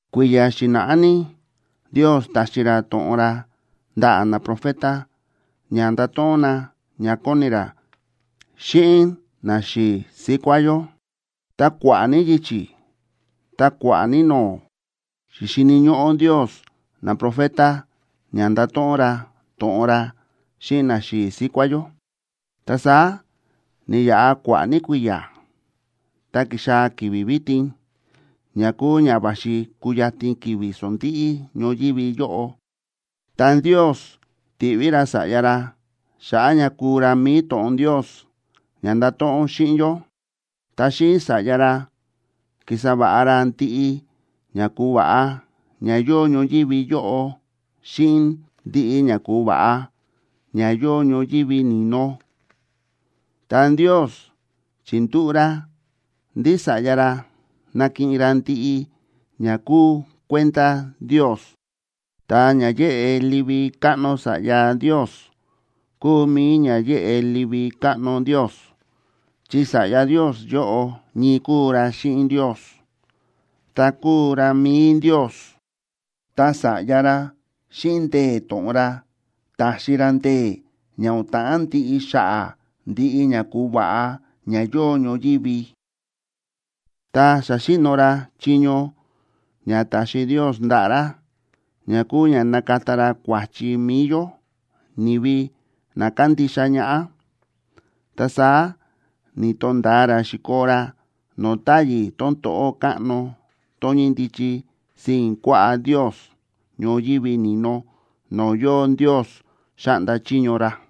Kui̱ya̱ xi̱na̱ꞌá ní Ndios ta̱xi ra to̱ꞌon ra ndaꞌa̱ naprofeta ña ndato̱ꞌon na ña kóni ra xíꞌin naxi̱i̱ síkuá yó. Ta kua̱ꞌa̱ ní yichi̱ ta kua̱ꞌa̱ ní no̱o̱, xi̱xini̱ ñóꞌó Ndios naprofeta ña nda̱to̱ꞌon ra to̱ꞌon ra xíꞌin naxi̱i̱ síkuá yó. Ta saá ni̱yaꞌa kua̱ꞌa̱ ní kui̱ya̱, ta ki̱xaa̱ ki̱vi̱ vitin ña kúu ña va̱xi kuyatin ki̱vi̱ sondíꞌí ñoyívi yóꞌo, ta Ndios ti̱ꞌví ra Sa̱ꞌya ra xa̱ꞌa̱ ña kúu ra mi̱i to̱ꞌon Ndios ña ndato̱ꞌon xíꞌin yó. Ta xíꞌin Sa̱ꞌya ra ki̱sa va̱ꞌa ra ndiꞌi ña ku̱va̱ꞌa ña yóo ñoyívi yóꞌo xíꞌin ndiꞌi ña ku̱va̱ꞌa ña yóo ñoyívi ni̱no. Ta Ndios chi̱ndúꞌu̱ ra ndí Sa̱ꞌya ra nakiꞌin ra ndiꞌi ña kúu kuenda Ndios. Ta ña yéꞌe livi káꞌno Sa̱ꞌya Ndios kúu mi̱i ña yéꞌe livi káꞌno Ndios, chi Sa̱ꞌya Ndios yóꞌo ñii kúu ra xíꞌin Ndios, ta kúu ra mi̱i Ndios. Ta Sa̱ꞌya ra xíꞌin ndee̱ to̱ꞌon ra ta̱xi ra ndee̱ ña o̱n ta̱ꞌán ndiꞌi xa̱ꞌa̱ ndiꞌi ña ku̱va̱ꞌa ña yóo ñoyívi. Tá sa̱xi̱no̱ ra chiño ña ta̱xi Ndios ndaꞌa̱ ra ña kúu ña na̱kata ra kua̱chi mi̱i yó, ni̱vi na kándixa ñaꞌá, ta saá ni̱to̱nda̱a ra xi̱koo ra no̱o̱ táyi̱ tón to̱ꞌó káꞌno tón ñíndichi sii̱n kuaꞌá Ndios ñoyívi ni̱no no̱o̱ yóo Ndios xáꞌnda chiño ra.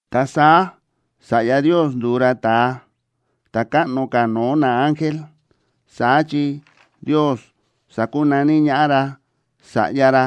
Ta saá Sa̱ꞌya Ndios ndu̱u ra ta̱a ta̱ káꞌno ka̱ no̱o̱ naángel, saá chi Ndios sa̱kunaní ñaꞌá ra Sa̱ꞌya ra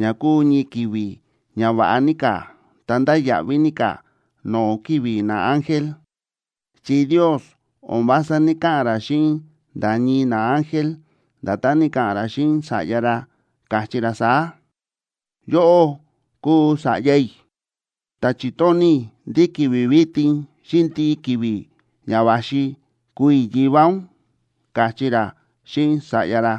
ña kúu ñii ki̱vi̱ ña va̱ꞌa ní ka̱ ta ndáya̱ꞌví ní ka̱ no̱o̱ ki̱vi̱ naángel. Chi Ndios o̱n vása ní‑kaꞌa̱n ra xíꞌin nda̱ ñii naángel, nda̱tán ni̱ka̱ꞌa̱n ra xíꞌin Sa̱ꞌya ra, káchí ra saá: Yóꞌó kúu Sa̱ꞌya i̱, ta chi̱tóni̱ i̱ ndí ki̱vi̱ vitin xíꞌin ndiꞌi ki̱vi̱ ña va̱xi kúu i̱ Yivá ún, káchí ra xíꞌin Sa̱ꞌya ra.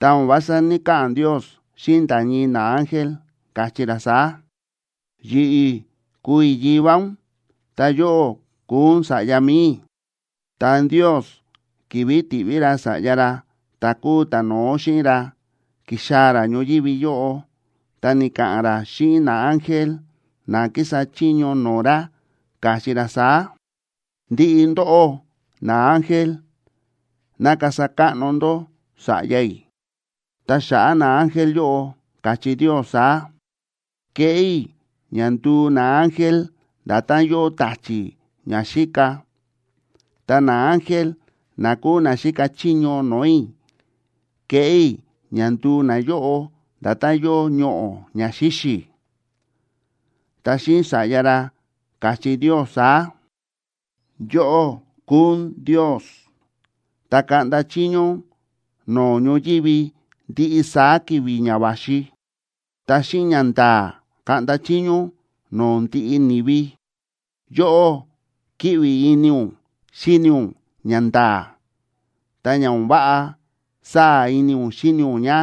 Ta o̱n vása ní‑kaꞌa̱n Ndios xíꞌin nda̱ ñii naángel, káchí ra saá: Yi̱ꞌi̱ kúu i̱ Yivá ún, ta yóꞌó kúu ún Sa̱ꞌya mi̱i i̱. Ta Ndios, ki̱vi̱ ti̱ꞌví ra Sa̱ꞌya ra ta̱ kúu ta̱no̱ó xíꞌin ra, ki̱xaa̱ ra ñoyívi yóꞌo, ta ni̱ka̱ꞌa̱n ra xíꞌin naángel na kísa chiño no̱o̱ ra, káchí ra saá: Ndiꞌi ndóꞌó naángel, ¡ná kasa káꞌno ndó Sa̱ꞌya i̱! Ta xa̱ꞌa̱ naángel yóꞌo, káchí Ndios saá: Kéꞌé i̱ ña nduu naángel nda̱tán yóo ta̱chi̱ ña xíka, ta naángel na kúu na xíka chiño no̱o̱ i̱, kéꞌé i̱ ña nduu nayóꞌo nda̱tán yóo ñoꞌo̱ ña xíxi̱. Ta xíꞌin Sa̱ꞌya ra, káchí Ndios saá: Yóꞌó kúu ún Ndios, ta kaꞌnda chiño ún no̱o̱ ñoyívi ndiꞌi saá ki̱vi̱ ña va̱xi, ta xíꞌin ñanda̱a̱ kaꞌnda chiño ún no̱o̱ ndiꞌi ni̱vi. Yóꞌó kíꞌvi ini ún xíni ún ñanda̱a̱, ta ña o̱n váꞌa, sáa̱ ini ún xíni ún ña;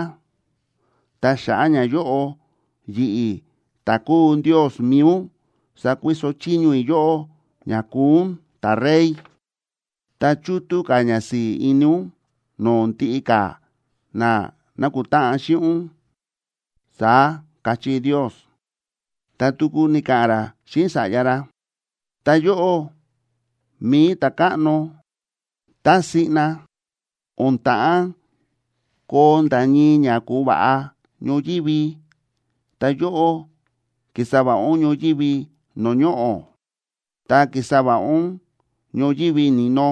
ta xa̱ꞌa̱ ñayóꞌo, yi̱ꞌi̱ ta̱ kúu Ndios mi̱i ún, sákuiso chiño i̱ yóꞌó ña kuu ún ta̱Rey, ta chútú ka̱ ñasi̱i̱ ini ún no̱o̱ ndiꞌi ka̱ na nákutáꞌan xíꞌin ún, saá káchí Ndios. Ta tuku ni̱ka̱ꞌa̱n ra xíꞌin Sa̱ꞌya ra: Ta yóꞌó, mi̱i Ta̱káꞌno, tá siꞌna o̱n ta̱ꞌán koo nda̱ ñii ña ku̱va̱ꞌa ñoyívi, ta yóꞌó ki̱sa va̱ꞌa ún ñoyívi no̱o̱ ñoꞌo̱, ta ki̱sa va̱ꞌa ún ñoyívi ni̱no,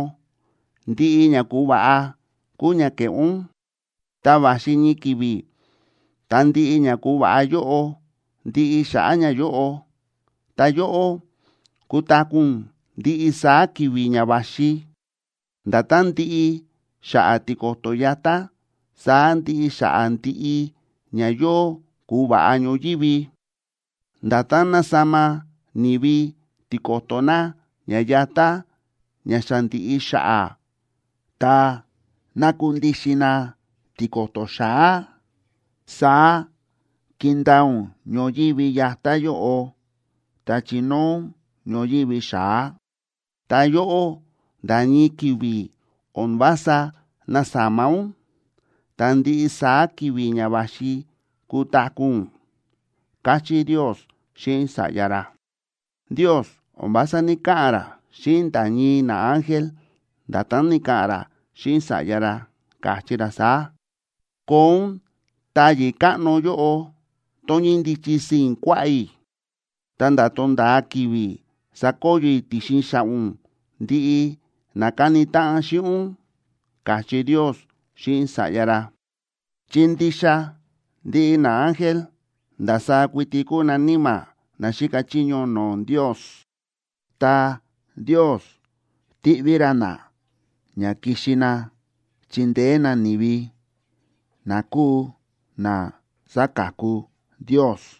ndiꞌi ña ku̱va̱ꞌa kúu ña ke̱ꞌé ún. Ta va̱xi ñii ki̱vi̱ tá ndiꞌi ña ku̱va̱ꞌa yóꞌo ndiꞌi xa̱ꞌa̱ ñayóꞌo, ta yóꞌó, kutaku̱ ún ndiꞌi saá ki̱vi̱ ña va̱xi. Nda̱tán ndíꞌi xa̱ꞌa̱ tiko̱to̱ yatá, saá ndiꞌi xa̱ꞌa̱ ndiꞌi ña yóo ku̱va̱ꞌa ñoyívi. Nda̱tán násama ni̱vi tiko̱to̱ na ña yatá ña xa ndi̱ꞌi xa̱ꞌa̱ ta nákundixin na tiko̱to̱ xa̱á, saá kindaa ún ñoyívi yatá yóꞌo, ta chinóo ún ñoyívi xa̱á. Ta yóꞌó, nda̱ ñii ki̱vi̱ o̱n vása násama ún, ta ndiꞌi saá ki̱vi̱ ña va̱xi kutaku̱ ún, káchí Ndios xíꞌin Sa̱ꞌya ra. Ndios o̱n vása ní‑kaꞌa̱n ra xíꞌin nda̱ ñii naángel, nda̱tán ni̱ka̱ꞌa̱n ra xíꞌin Sa̱ꞌya ra, káchí ra saá: Koo ún táyi̱ káꞌno yóꞌo, tón ñíndichi sii̱n kuaꞌá i̱, ta̱nda̱ tonda̱a ki̱vi̱ sakoyo i̱ ti̱xin xa̱ꞌa̱ ún ndiꞌi na káni táꞌan xíꞌin ún, káchí Ndios xíꞌin Sa̱ꞌya ra. Chi ndixa ndiꞌi naángel ndasaá kuiti kúu na níma̱ na xíka chiño no̱o̱ Ndios, ta Ndios tíꞌví ra na ña kixi na chindeé na ni̱vi na kúu na saka̱ku Ndios.